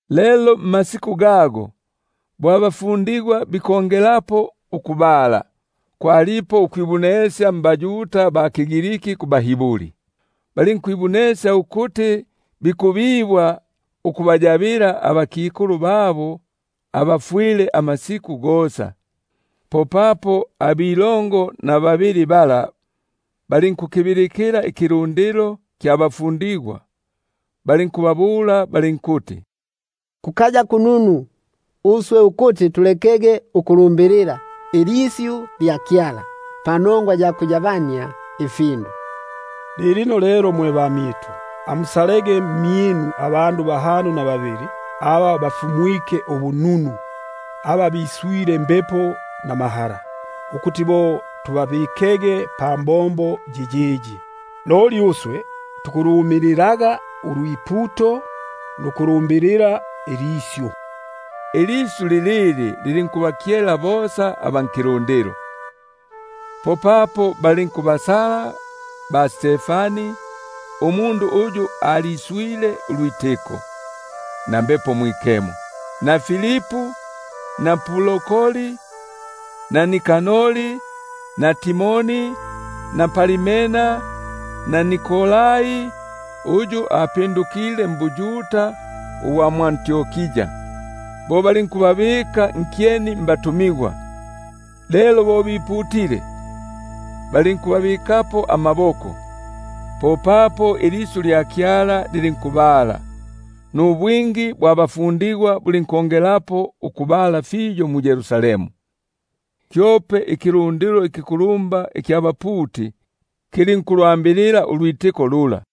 Lelo mmasiku gago, bo abafundigwa bikongelapo ukubala, kwalipo ukwibunesya nabaGriki kubaHiburi, papo bibwaga ukubabombela abakikulu abafwile amasiku gosa. Popapo abakalongo na babili bala balinkukibilikila ikilundilo kya bafundigwa, balinkubabula balinkuti: Kukaya kununu uswe ukulileka ilisyu lya Kyala, nukufibombela ifindu. Lilino lelo mwe bamyitu, amusalege mmyinu abandu bahano na babili, aba bafumwike ubununu, aba biswile Mbepo namahala, ukuti bo tubabikege pambombo yiyiyi. Loli uswe tukulumililaga ulwiputo, nukulibombela ilisyu. Ilisyu lilili lilinkubakyela bosa aba nkilundilo, popapo balinkubasala ba-Stefani, umundu uyu aliswile ulwitiko na Mbepo Mwikemo, na Filipu na Prokori, na Nikanori na Timoni, na Parmena na Nikolai umwingisigwa mbuYuda gwa mwʼAntiokia; bo balinkubabika nkyeni mbatumigwa. Lelo bo biputile, balinkubabikapo amaboko. Popapo ilisyu lya Kyala lilinkubala, nubwingi bwa bafundigwa bulinkongelapo ukubala fiyo mu-Yerusalemu; kyope ikilundilo ikikulumba ikya baputi kilinkulukonga ulwitiko lula.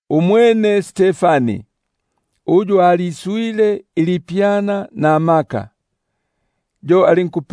Umwene Stefani, uyu aliswile ilipyana namaka, yo alinku-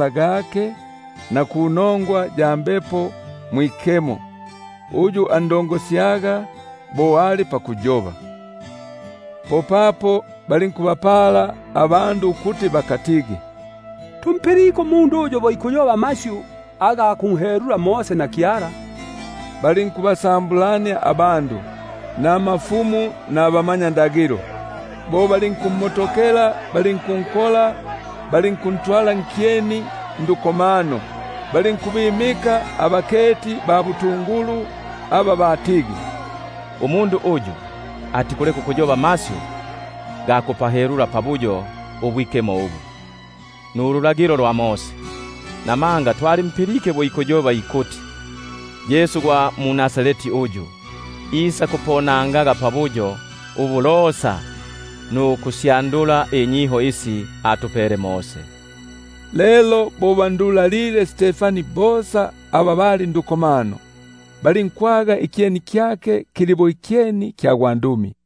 ga Mbepo ifi ayobelangamo. Popapo balinkubapala abandu ukuti mukatigi: Tumpilike umundu uyu bo ikuyoba amasyu aga kunhelula Mose na Kyala; balinkubasambulania abandu, nabakulumba nabamanyakalata, bo balinkummotokela balinku- nkola, balinkuntwala nkyeni ndukomano, balinkubimika abaketi ba butungulu aba batigi: Umundu yuyuyu atikuleka ukuyoba amasyu ga kupahelula pabuyo ubwikemo ubu, napalulagilo; buno tumpilike bo ikuyoba ikuti: Yesu gwa mu-Nazareti uyu, isakuponangaga pabuyo ubu nukusyandula inyiho isi atupele Mose. Lelo bo bandulalile bosa aba bali ndukomano, balinkwaga ikyeni kyake kili bo ikyeni kya gwandumi.